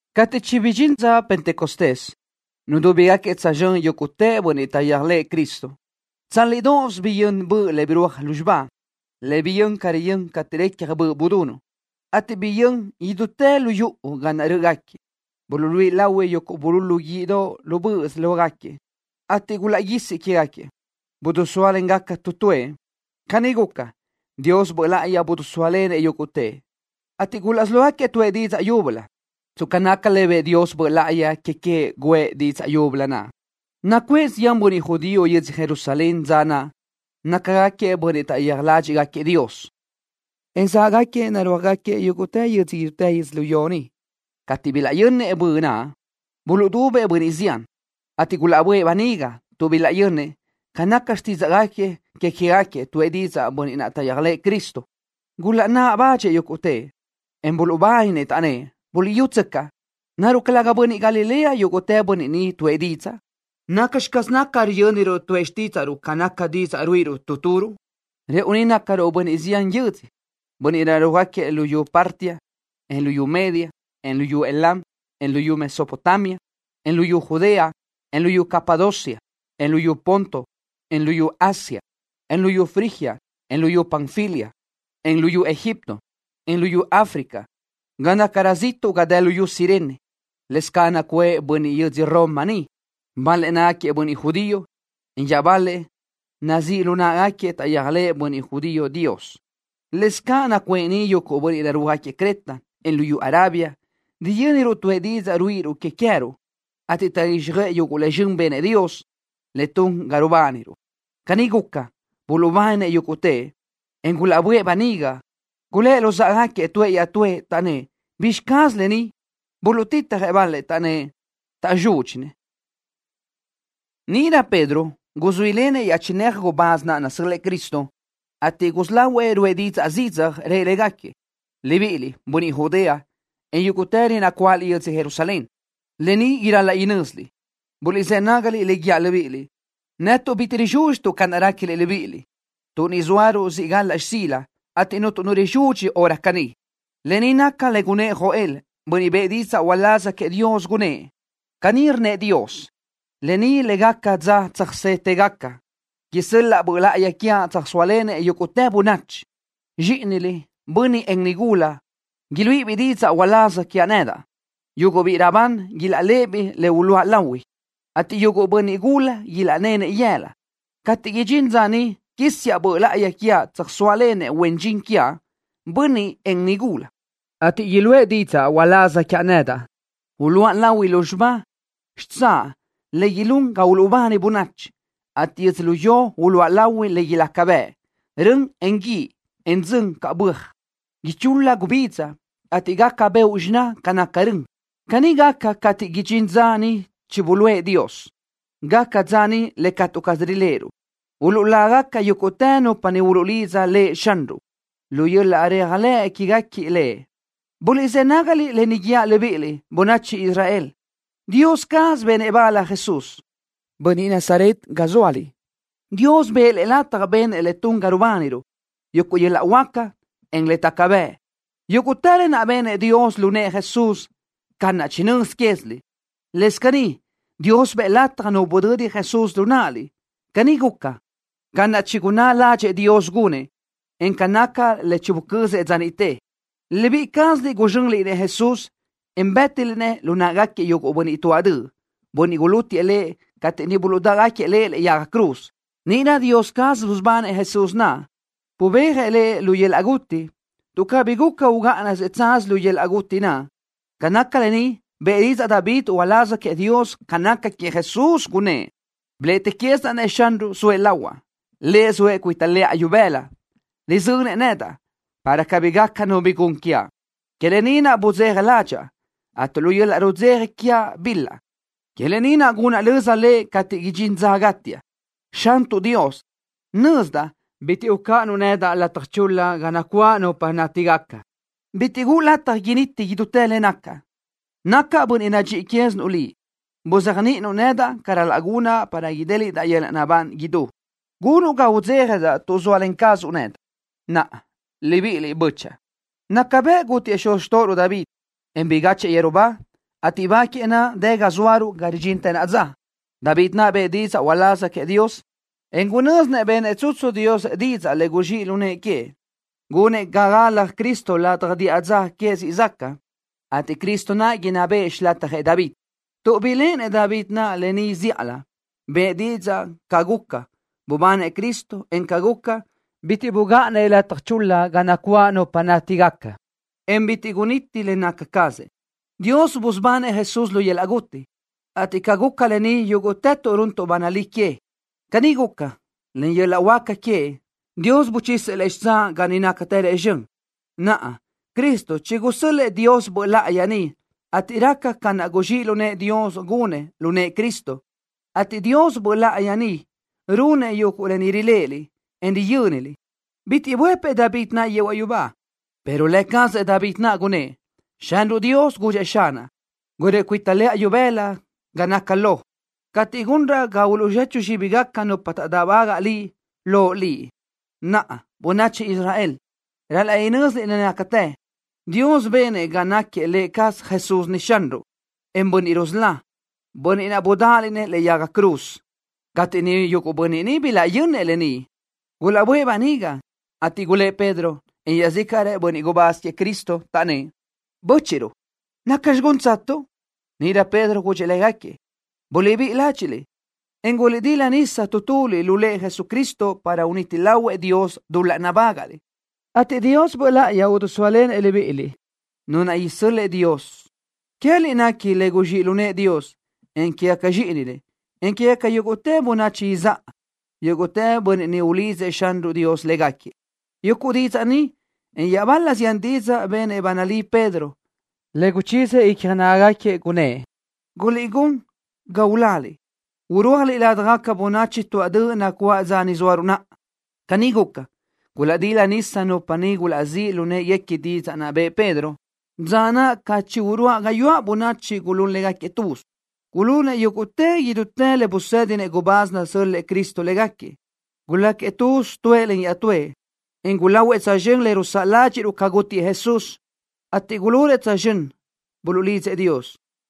Cateʼ chibidxín dza Pentecostés, nudúbigaquiëʼ tsözxö́n yúguʼtë bönniʼ taʼyéajlëʼë Cristo. Tsálidoʼos biyö́n bö le birúaj lúzxiba, le biyö́n ca riyö́n cateʼ recja böʼ budunuʼ, ateʼ biyö́n idútë lu yuʼu ga naʼ rö́ʼögaquiëʼ. Buluʼluíʼi lahui yuguʼ bululu guíʼdoʼ lu böʼös lógaquiëʼ, ateʼ gulaʼguísi que queë́gaquiëʼ. Bidisóalengaca tu tuëʼ. Caní guca, Dios Böʼ Láʼayi bidisóalenëʼ yúguʼtëʼ, ateʼ gulaʼsí lógaquiëʼ tuʼë didzaʼ yúbölö, tsca naca le bëʼë Dios Böʼ Láʼayi que queëʼ guʼë didzaʼ yúbölö naʼ. Nacuʼë zián bönniʼ judío yödzö Jerusalén dza naʼ, nácagaquiëʼ bönniʼ taʼyéaj ládxiʼgaquiëʼ Dios, en záʼgaquiëʼ narúajgaquiëʼ yúguʼtë yödzö idútë yödzölió ni. Cateʼ bilaʼyönnëʼ bö naʼ, buluʼdubëʼ bönniʼ zián, ateʼ gulaʼbö́ʼë böniga, tuʼ bilaʼyönnëʼ, ca naca xtídzaʼgaquiëʼ que queë́gaquiëʼ, tuʼë didzaʼ bönniʼ naʼ taʼyéajlëʼë Cristo. Gulaʼnáʼ badxëʼ yúguʼtëʼ, en buluʼbáninë, taʼnnë́ʼ: —Buliʼyútsöcaʼ. ¿Naruʼ calëga bönniʼ Galilea yúguʼtë bönniʼ ni tuʼë didzaʼ? ¿Nacxi caz naca riyö́niruʼ tuʼë xtídzaʼruʼ ca naca didzaʼ ruíʼiruʼ tu turuʼ? Rëʼu ni nácaruʼ bönniʼ zián yödzö, bönniʼ narúajgaquiëʼ luyú Partia, en luyú Media, en luyú Elam, en luyú Mesopotamia, en luyú Judea, en luyú Capadocia, en luyú Ponto, en luyú Asia, en luyú Frigia, en luyú Panfilia, en luyú Egipto, en luyú Africa, ga nácarö ziʼtuʼ ga dë luyú Cirene. ’Lëscaʼ nacuʼë bönniʼ yödzö Roma ni. Bal-lëʼ nácagaquiëʼ bönniʼ judío, en iaʼbal-lëʼ nazíʼ lu náʼagaquiëʼ le taʼyéajlëʼë bönniʼ judío Dios. Lëscaʼ nacuʼë ni yuguʼ bönniʼ narúajgaquiëʼ Creta, en luyú Arabia. Riyö́niruʼ tuʼë didzaʼ ruíʼiruʼ que queë́ruʼ, ateʼ taʼguíxjöʼë yuguʼ le zxön benëʼ Dios, le tun ga rubániruʼ. Caní guca, buluʼbáninë yúguʼtëʼ, en gulaʼbö́ʼë böniga. Gulë́ luzáʼagaquiëʼ tuëʼ iaʼtúëʼ, taʼnnë́ʼ: —¿Bizxi caz lë ni? Buluʼtitjëʼ bal-lëʼ, taʼnnë́ʼ: —¡Taʼzúdxinëʼ! Níʼirö Pedro guzuílenëʼ iaʼchinéajëʼ gubáz naʼ nasö́l-lëʼë Cristo, ateʼ gusí lahuëʼ ruʼë zidzaj didzaʼ, rëʼ légaquiëʼ: —¡Libíʼiliʼ, bönniʼ Judea, en yúguʼtëliʼ nacuáʼaliʼ yödzö Jerusalén! ¡Lë ni ral-laʼ inö́ziliʼ! ¡Buliʼzë́ nágaliʼ le guíaʼ libíʼiliʼ! Netuʼ ni bitiʼ rizúdxituʼ ca naʼ réquiliʼ libíʼiliʼ, tuʼ ni zóaruʼ siʼ galaʼ xsila, ateʼ cuntu nu rizudxi hora caní. Lë ni naca le gunnë́ʼ Joel, bönniʼ bëʼë didzaʼ uláz queëʼ Dios, gunnë́ʼ: Caní rnnëʼ Dios: Lë ni le gaca dza tsöjsétëgaca. Isö́l-laʼa Böʼ Láʼayi quiaʼ, tsöjsóalenëʼ yúguʼtë bönachi. Zxíʼiniliʼ, bönniʼ, en nigula, iluíʼibiʼ didzaʼ uláz quiaʼ nedaʼ. Yuguʼ biʼi raʼbán ilaʼléʼebiʼ le uluʼa lahui, ateʼ yuguʼ bönniʼ gula ilaʼnenëʼ yëla. Cateʼ idxín dza niʼ quísiaʼ Böʼ Láʼayi quiaʼ, tsöjsóalenëʼ huen dxin quiaʼ, bönniʼ, en nigula, ateʼ iluʼë didzaʼ uláz quiaʼ nedaʼ. Uluʼa lahui lúzxiba xitsáʼ le ilún ga uluʼbani bönachi, ateʼ yödzölió uluʼa lahui le ilaca bëʼ, rön, en guíʼ, en dzön ca böaj. Ichul-la gubidza, ateʼ gaca beoʼ xiná ca naca rön. Caní gaca cateʼ idxín dza niʼ chibuluʼë Dios. Gaca dza niʼ le catu caz riléʼeruʼ. Uluʼlágaca yúguʼtë nupa niʼ uluʼlidza Lëʼ Xanruʼ, lu yöl-laʼ réajlëʼ quéguequi Lëʼ. ’Buliʼzë́ nágaliʼ lë ni guíaʼ libíʼiliʼ, bönachi Israel. Dios caz benëʼ bal Jesús, bönniʼ Nazaret ga zóaliʼ. Dios bëʼë Lëʼ lataj benëʼ le tun ga rubániruʼ, yuguʼ yöl-laʼ huáca, en le taca bëʼ. Yúguʼtë lë naʼ benëʼ Dios lu nëʼë Jesús, ca naʼ chinö́z quéziliʼ. Lëscaʼ caní, Dios bëʼë lataj nu budödi Jesús lu náʼaliʼ. Caní guca, ca naʼ chigunná ládxëʼë Dios gunëʼ, en ca naca le chibucözëʼ dza niʼte. Libíʼi cázaliʼ guzxönliʼ-nëʼ Jesús, en bë́tiliʼ-nëʼ lu náʼagaquiëʼ yuguʼ bönniʼ tuáʼ döʼ, bönniʼ gulútiëʼ Lëʼ cateʼ niʼ buluʼdáʼgaquiëʼ Lëʼ lëʼe yaga cruz. Níʼirö Dios caz busubanëʼ Jesús naʼ. Bubéajëʼ Lëʼ lu yöl-laʼ guti, tuʼ cabí guca ugáʼanëʼ tsaz lu yöl-laʼ guti naʼ. Ca naca lë ni, bëʼë didzaʼ David uláz queëʼ Dios ca naca queëʼ Jesús, gunnë́ʼ: Biléʼetiquiʼsidaʼ-nëʼ Xanruʼ, zoëʼ lahuaʼ. Lëʼ zoëʼ cuita lëʼa ibëla, rizönëʼ nedaʼ, para cabí gaca nu bi gun quiaʼ. Que lë ni naʼ budzeja ládxaʼa, ateʼ lu yöl-laʼ rudzeja quiaʼ bil-laʼ. Que lë ni naʼ gunaʼ löza Lëʼ cateʼ idxín dza gátiaʼ. Xantuʼ Dios, nözdaʼ bitiʼ ucáʼanuʼ nedaʼ lataj chul-la ga nacuáʼ nupa nátigaca. Bitiʼ guʼu lataj initi idútë le nacaʼ. Nacaʼ bönniʼ nadxíʼi quézinuʼ Liʼ. Buzéajniʼinuʼ nedaʼ ca ral-laʼ gunaʼ para idéliʼdaʼ yöl-laʼ naʼbán idú. Gunuʼ ga udzéjadaʼ tuʼ zóalen cazuʼ nedaʼ. ’Naʼa, libíʼiliʼ, bö́chaʼa. Naca bëʼ gútiëʼ xuz xtóʼoruʼ David, en bigáchëʼë yeru ba, ateʼ ba queëʼ naʼ dë ga zóaruʼ ga ridxintë naʼa dza. David naʼ bëʼë didzaʼ uláz queëʼ Dios, en gunö́zinëʼ benëʼ tsutsu Dios didzaʼ le guzxíʼ lu nëʼë queëʼ, gunëʼ ga galjëʼ Cristo ladaj diʼa dza queëʼ siʼ záʼgaca, ateʼ Cristo naʼ inná bëʼë xilatjëʼ David naʼ. Tuʼ biléʼenëʼ David lë ni zíʼalö, bëʼë didzaʼ ca guca, bubanëʼ Cristo, en ca guca, bitiʼ bugáʼanëʼ lataj chul-la ga nacuáʼ nupa nátigaca, en bitiʼ guniti le naca cazëʼ. Dios busubanëʼ Jesús lu yöl-laʼ guti, ateʼ ca guca lë ni yúguʼtëtuʼ runtuʼ ba nalí que. Caní guca, len yöl-laʼ huáca queëʼ, Dios buchisëʼ Lëʼ xitsáʼ ga niʼ nácatërëʼ zxön. Naʼa, Cristo chigusö́l-lëʼë Dios Böʼ Láʼayi ni, ateʼ raca ca naʼ guzxíʼ lu nëʼë Dios gunëʼ lu nëʼë Cristo, ateʼ Dios Böʼ Láʼayi naʼ runëʼ yuguʼ lë ni riléʼeliʼ, en riyö́niliʼ. Bitiʼ buëpëʼ David naʼ yehuaʼ yubá, pero lë cazëʼ David naʼ gunnë́ʼ: Xanruʼ Dios gudxëʼ Xanaʼ: Guröʼi cuita lëʼa ibëla ga naca lo cateʼ gunraʼ ga uluʼzechu zxíbigaca nupa taʼdáʼbagaʼ Liʼ loʼ Liʼ. ’Naʼa, bönachi Israel, ral-laʼ inö́ziliʼ le nácatë. Dios benëʼ ga náquiëʼ Lë cazëʼ Jesús ni Xanruʼ, en Bönniʼ Rusölá, bönniʼ naʼ budáʼaliʼ-nëʼ lëʼe yaga cruz. Cateʼ yuguʼ bönniʼ niʼ bilaʼyönnëʼ lë ni, gulaʼböʼë böniga, ateʼ gulë́ʼ Pedro, en iaʼzícaʼrëʼ bönniʼ gubáz queëʼ Cristo, taʼnnë́ʼ: —Bö́chiʼruʼ, ¿nacxi gúntsatuʼ? Níʼirö Pedro gudxëʼ légaquiëʼ: —Buliʼbíʼi ládxiʼliʼ, en guliʼdila nisa tu tuliʼ lu Lëʼ Jesucristo para uniti lahuëʼ Dios dul-laʼ nabágaʼliʼ, ateʼ Dios Böʼ Láʼayi idisóalenëʼ libíʼiliʼ, Nu naʼ isö́l-lëʼë Dios. Queë́liʼ nequi le guzxíʼ lu nëʼë Dios, en quégaca zxíʼiniliʼ, encaʼ quégaca yúguʼtë bönachi izáʼa, yúguʼtë bönniʼ niʼ ulidzëʼ Xanruʼ Dios légaquiëʼ. Yuguʼ didzaʼ ni, en iaʼbal-la zián didzaʼ benëʼ ba nalí Pedro, le guchíziëʼ icja nágagaquiëʼ, gunnë́ʼ: —Guliʼgún ga uláliʼ, irúajliʼ ládjagaca bönachi tuáʼ döʼ nacuáʼ dza ni zóaruʼ naʼa. Caní guca, gulaʼdila nisa nupa niʼ gulaʼzíʼ lu në́ʼeguequi didzaʼ naʼ bëʼë Pedro. Dza naʼ ca chi uruáʼ gayuáʼ bönachi gulún légaquiëʼ tuz. Gulunëʼ yúguʼtëʼ idútë le buluʼsédinëʼ gubáz nasö́l-lëʼë Cristo légaquiëʼ. Guláquiëʼ tuz tuëʼ len iaʼtúëʼ, en gulahuëʼ tsözxö́n le rusáʼ ládxiʼruʼ ca gútiëʼ Jesús, ateʼ gulunëʼ tsözxö́n, buluʼlidzëʼ Dios.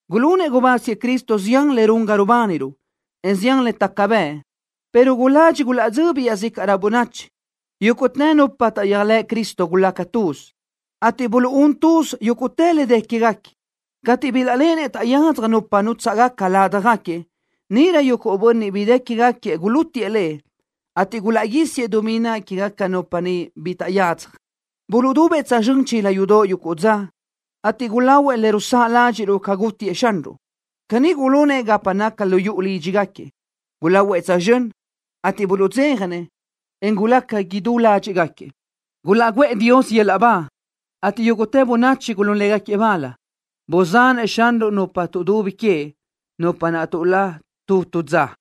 Gulunëʼ gubáz queëʼ Cristo zián le run ga rubániruʼ, en zián le taca bëʼ, pero guladxi gulaʼdzöbi iaʼzícaʼrö bönachi. Yúguʼtë nupa naʼ taʼyéajlëʼ Cristo gulaca tuz, ateʼ buluʼún tuz yúguʼtë le dë quéguequi. Cateʼ bilaʼléʼenëʼ taʼyadzaj nupa nútsaʼgaca ládjagaquiëʼ, níʼirö yuguʼ bönniʼ bi dë quégaquiëʼ gulútiʼë le, ateʼ gulaʼguísiëʼ dumí naʼ que queë́gaca nupa niʼ bi taʼyadzaj. Buluʼdubëʼ tsözxö́n chila yudoʼ yuguʼ dza, ateʼ gulahuëʼ le rusáʼ ládxiʼruʼ ca gútiëʼ Xanruʼ. Caní gulunëʼ gapa naca lu yuʼu lídxigaquiëʼ. Gulahuëʼ tsözxö́n, ateʼ buluʼdzéjanëʼ, en gulaca idú ládxiʼgaquiëʼ. Gulaʼguʼë Dios yöl-laʼ ba, ateʼ yúguʼtë bönachi gulún légaquiëʼ bal. Buzanëʼ Xanruʼ nupa tuʼdubi queëʼ, nupa naʼ tuʼlá tu tu dza.